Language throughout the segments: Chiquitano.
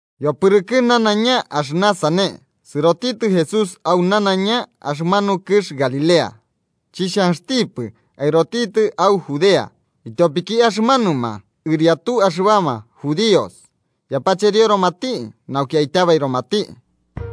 Yopɨrɨkɨ nanaiña axɨna sane, sɨrotitɨ Jesús au nanaiña axɨmanu kɨx Galilea. Chixhanxtipɨ aɨrotitɨ au Judea, ityopiki axɨmanuma ɨriatu axɨbama judíos yapacherioromati nauki aityabairomati.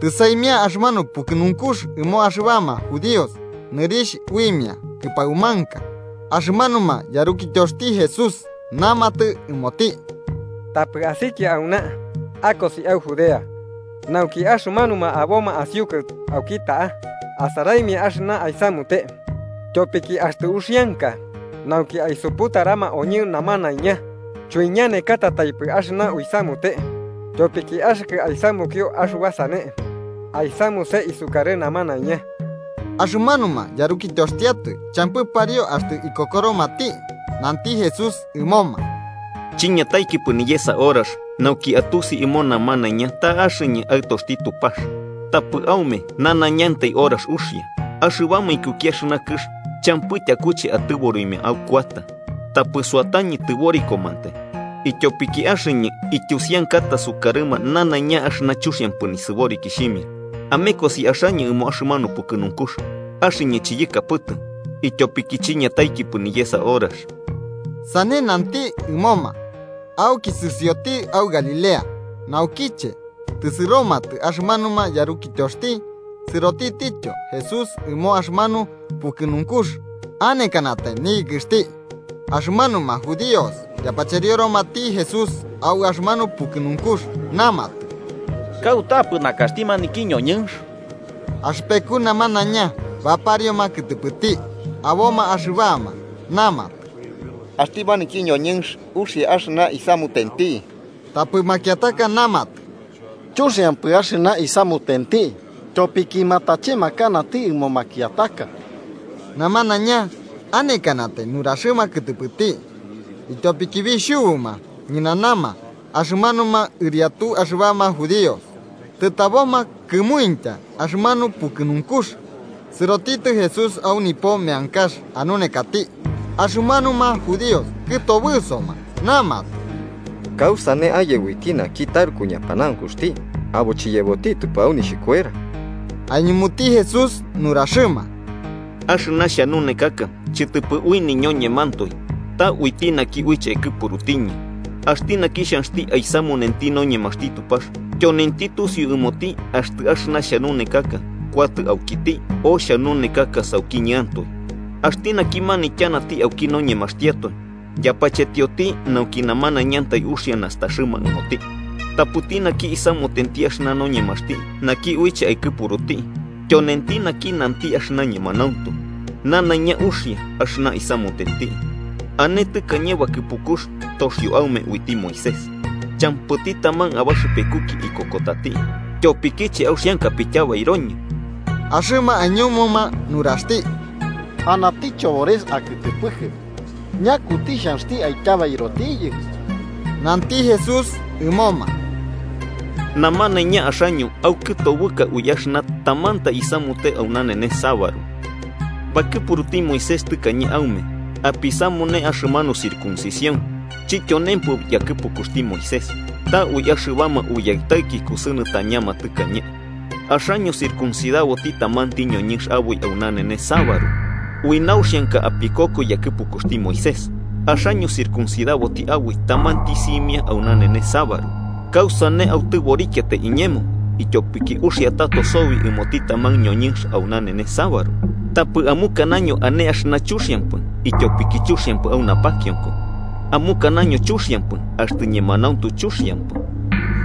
Tɨsaimia axɨmanu pukɨnunkux ɨmo axɨbama judíos, nɨrixh uimia Kɨpaumanka, axɨmanuma yarukityoxti Jesús namatɨ ɨmoti: –Tapɨ asikia auna. Akosi au Judea, nauki axɨmanuma aboma asiukɨ auki ta'a asaraimia axɨna aisamute. Tyopiki axtɨ uxianka nauki aisuputarama oñɨ namanaiña, chuiñanekatataipɨ axɨna uisamute. Tyopiki axɨkɨ aisamukio axɨba sane, aisamuse isukarɨ namanaiña. Axɨmanuma yarukityoxtiatoe champɨ pariu axtɨ ikokoromati. Nanti Jesús ɨmoma: –Chiñataikipɨ niyesa horax nauki atusi ɨmo namanaiña ta axɨñɨ Aɨtoxti Tupax. Tapɨ aume nanañantai horax uxia. Axɨbama ikuki axɨna kɨx champɨ tyakuche atɨborimia aukuata. Tapɨ suatañɨ tɨborikomantai, ityopiki axɨñɨ ityusiankata sukarɨma nanaiña axɨna chuxiampɨ nisɨborikixhimia. Amekosi axaño ɨmo axɨmanu pukɨnunkux. Axɨñɨ chiyɨkapɨtɨ, ityopiki chiñataikipɨ niyesa horax. Sane nanti ɨmoma, auki sɨsioti au Galilea. Naukiche tɨsɨromatɨ axɨmanuma yarukityoxti, sɨrotitityo Jesús ɨmo axɨmanu pukɨnunkux, anekanatai niyɨkɨxti. Axɨmanuma judíos yapacherioromati Jesús au axɨmanu pukɨnunkux, namatɨ: –¿Kautapɨ nakaxti maniki ñoñɨnx? Axɨpeku namanaiña baparioma kɨtɨpɨti. Aboma axɨbama namatɨ: “Axti maniki ñoñɨnx uxia axɨna isamutenti”. Tapɨ makiataka namatɨ: “Chuxiampɨ axɨna isamutenti. Tyopiki matachemakanati ɨmo makiataka.” Namanaiña anekanatai nuraxɨma kɨtɨpɨti, ityopiki bixhubuma ñɨnanama axɨmanuma ɨriatu axɨbama judíos. Tɨtaboma kɨmuintya axɨmanu pukɨnunkux, sɨrotitɨ Jesús au nipo meankax anunekati. Axɨmanuma judíos kɨtobɨsoma namatɨ: –¿Kausane aye uiti naki taruku ñapanaunkuxti, abo chiyebotitɨpɨ au nixhikuera? Aiñumuti Jesús nuraxɨma: –Axɨna xhanunekaka chɨtɨpɨ ui niñoñemantoe ta uiti naki uiche aikɨpurutiñɨ. Axti naki xhanxti aisamunenti noñemaxti Tupax, tyonenti tusiu ɨmoti axtɨ axɨna xhanunekaka kuatɨ aukiti, o xhanunekaka saukiñɨantoe. Axti naki manityanati auki noñemaxtiatoe, yapachetioti nauki namanaiñantai uxia nastaxɨma ɨmoti. Tapɨti naki isamutenti axɨna noñemaxti naki uiche aikɨpuruti, tyonenti naki nanti axɨna ñemanauntu. Nanaiña uxia axɨna isamutenti. “¿Ane tɨkañe bakɨpukux toxio aume uiti Moisés? Champɨti taman abaxɨpekuki ikokotati. ¿Tyopikiche auxianka apityabairoñɨ? Axɨma aiñumuma nuraxti: –Anati chobores akɨtɨpɨkɨ, ¿Ñakuti xhanxti aityabairotiyɨ? Nanti Jesús ɨmoma: –Namanaiña axaño aukɨtobɨka ui axɨna tamantai isamute au nanenes sabaru. Bakɨpuruti Moisés tɨkañe aume apisamune axɨmanu circuncición chityonempɨ yakɨpukuxti Moisés, ta ui axɨbama uyaɨtaiki kusɨnɨtañama tɨkañe, axaño circuncidaboti tamanti ñoñɨnx aboi au nanenes sabaru. Ui nauxianka apikoko yakɨpukuxti Moisés, axaño circuncidaboti aboi tamanti simia au nanenes sabaru, ¿kausane autɨborikiatai iñemo ityopiki uxɨa tato sobi ɨmoti taman ñoñɨnx au nanenes sabaru? Tapɨ amukanaño ane axɨna chuxiampɨ ityopiki chuxiampɨ au napakionko, amukanaño chuxiampɨ axtɨ ñemanauntu chuxiampɨ.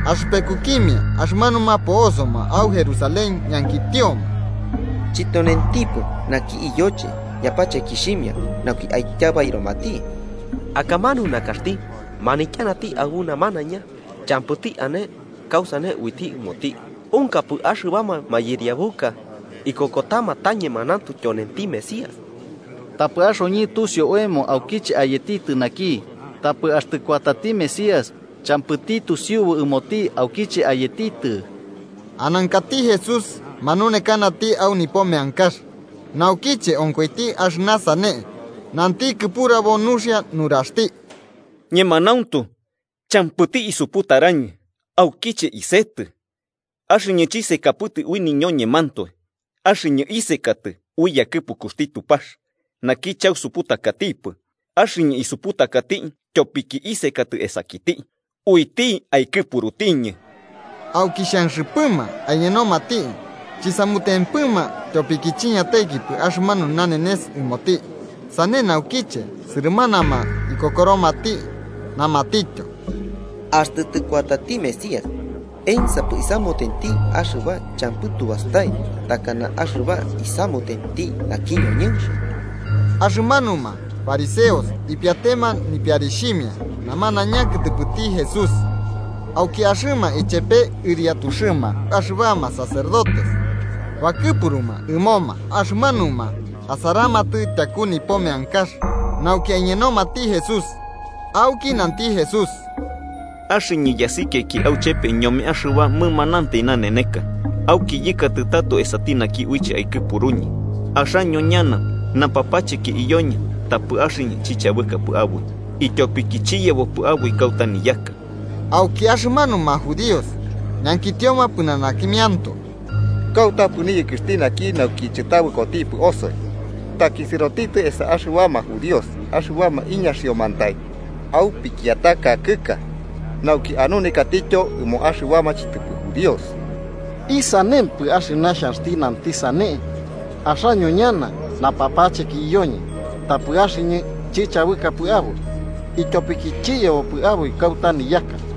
Axɨpekukimia axɨmanuma po'osoma au Jerusalén ñankitioma: –¿Chityonentipɨ naki iyoche yapachekixhimia nauki aityabairomati? Akamanu nakaxti, manityanati aɨbu namanaiña, champɨti ane kausane uiti ɨmoti. ¿Unkapɨ axɨbama mayɨriabuka ikokotama ta ñemanauntu tyonenti Mesías? Tapɨ axoñɨ tusiu oemo aukiche ayetitɨ naki, tapɨ axtɨ kuatati Mesías, champɨti tusiubu ɨmoti aukiche ayetitɨ. Anankati Jesús manunekanati au nipo meankax, naukiche onkoiti axɨna sane, nanti kɨpurabo nuxia nuraxti: –¡Ñemanauntu, champɨti isuputarañɨ, aukiche isetɨ! Axɨñɨ chisekapɨtɨ ui niñoñemantoe. Axɨñɨ isekatɨ ui yakɨpukuxti Tupax, naki chausuputakatipɨ. Axɨñɨ isuputakati tyopiki isekatɨ esakiti, uiti aikɨpurutiñɨ. Auki xanxɨpɨma aiñenomati, chisamutempɨma tyopiki chiñataikipɨ axɨmanu nanenes ɨmoti. Sane naukiche, sɨrɨmanama ikokoromati, namatityo: –Axtɨ tɨkuatati Mesías, ¿ensapɨ isamutenti axɨba champɨ tu bastai takana axɨba isamutenti naki ñoñɨnx? Axɨmanuma fariseos ipiatema nipiarixhimia namanaiña kɨtɨpɨti Jesús. Auki axɨma ichepe ɨriatuxɨma axɨbama sacerdotes bakɨpuruma ɨmoma axɨmanuma asaramatɨ tyaku nipo meankax nauki aiñenomati Jesús. Auki nanti Jesús: –Axɨñɨ yasikiaiki auchepe ñome axɨba mɨmanantai naneneka, auki yɨkatɨ tato esati naki uiche aikɨpuruñɨ. Axaño ñana napapacheki iyoñɨ, tapɨ axɨñɨ chichabɨkapɨ aboi, ityopiki chiyebopɨ aboi kauta niyaka. Auki axɨmanuma judíos ñankitioma pɨnanakimiantoe: –¿Kautapɨ niyɨkɨxti naki, nauki chɨtabɨkotipɨ osoi? ¿Taki sɨrotitɨ esa axɨbama judíos axɨbama iñaxiomantai au pikiataka kɨx, nauki anunekatityo ɨmo axɨbama chɨtɨpɨ judíos? ¿Isanempɨ axɨna xhanxti nanti sane: ‘Axaño ñana napapacheki iyoñɨ, tapɨ axɨñɨ chichabɨkapɨ aboi, ityopiki chiyebopɨ aboi kauta niyaka’?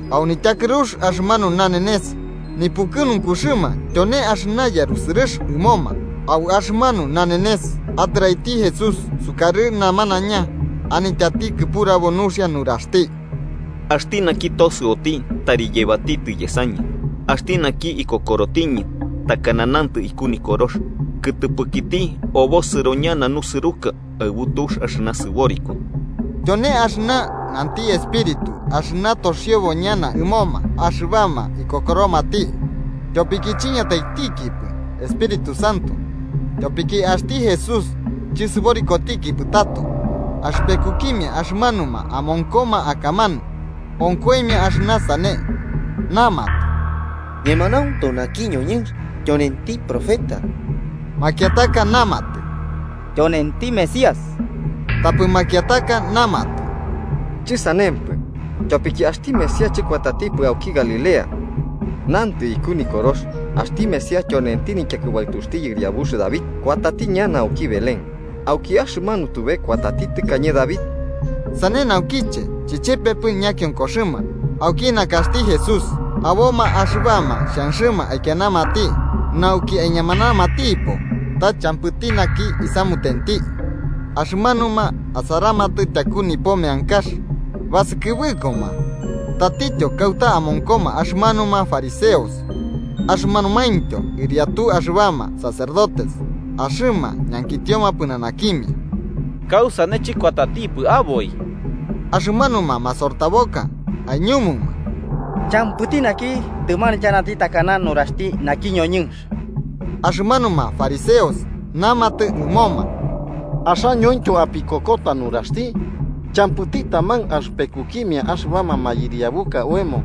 Au nityakɨrux axɨmanu nanenes nipukɨnunkuxɨma tyone axɨna yarusɨrɨx ɨmoma. Au axɨmanu nanenes atɨraiti Jesús sukarɨ namanaiña, anityati kɨpurabo nuxia nuraxti: –Axti naki tosɨoti, tari yebatitɨ yesañɨ. Axti naki ikokorotiñɨ, takana nantɨ iku Nikorox, kɨtɨpɨkiti obosɨro ñana nusɨruka aɨbu tux axɨna sɨboriko. Tyone axɨna nanti Espíritu axɨna toxiobo ñana ɨmoma axɨbama ikokoromati, tyopiki chiñataitikipɨ Espíritu Santo, tyopiki axti Jesús chɨsɨborikotikipɨ tato. Axɨpekukimia axɨmanuma amonkoma akamanu, onkoimia axɨna sane, namatɨ: –Ñemanauntu naki ñoñɨnx tyonenti profeta. Makiataka namatɨ: –Tyonenti Mesías. Tapɨ makiataka namatɨ: –Chɨsanempɨ, tyopiki axti Mesías chɨkuatatipɨ auki Galilea. Nantɨ iku Nikorox axti Mesías tyonenti nityakɨbaɨtuxti yɨriabux David, kuatati ñana auki Belén, auki axɨmanu tube kuatati tɨkañe David. Sane naukiche chichepepɨ ñakionkoxɨma auki nakaxti Jesús. Aboma axɨbama xhanxɨma aikianamati nauki aiñamanamatipo, ta champɨti naki isamutenti. Axɨmanuma asaramatɨ tyaku nipo meankax basɨkɨbɨkoma tatityo kauta amonkoma axɨmanuma fariseos axɨmanumaintyo ɨriatu axɨbama sacerdotes. Axɨma ñankitioma pɨnanakimia: –¿Kausane chɨkuatatipɨ aboi? Axɨmanuma masortaboka aiñumuma: –Champɨti naki tɨmanityanati takana nuraxti maniki ñoñɨnx. Axɨmanuma fariseos namatɨ ɨmoma: –Axañointyo apikokota nuraxti. ¿Champɨti taman axɨpekukimia axɨbama mayɨriabuka oemo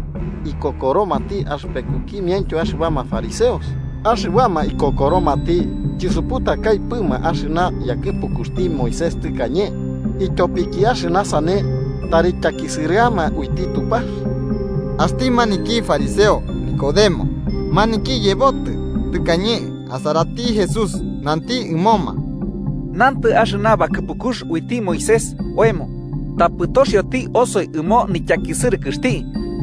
ikokoromati axɨpekukimiaintyo axɨbama fariseos? Axɨbama ikokoromati chisuputakaipɨmi axɨna yakɨpukuxti Moisés tɨkañe, ityopiki axɨna sane tari tyakisɨrɨama uiti Tupax. Axti maniki fariseo Nicodemo, maniki yebotɨ tɨkañe asarati Jesús, nanti ɨmoma: 51–Nantɨ axɨna bakɨpukux uiti Moisés oemo, tapɨ toxioti osoi ɨmo nityakisɨrɨkɨxti,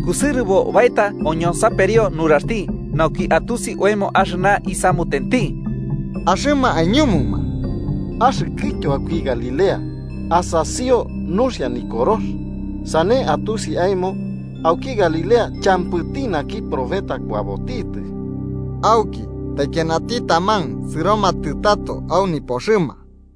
kusɨrɨbo baeta oñonsaperio nuraxti, nauki atusi oemo axɨna isamutenti. Axɨma aiñumuma: –Axɨkɨtyo auki Galilea, asasio nuxia Nikorox, sane atusi aemo auki Galilea champɨti naki profeta kuabotitɨ. Auki, taikianati taman sɨromatɨ tato au nipoxɨma.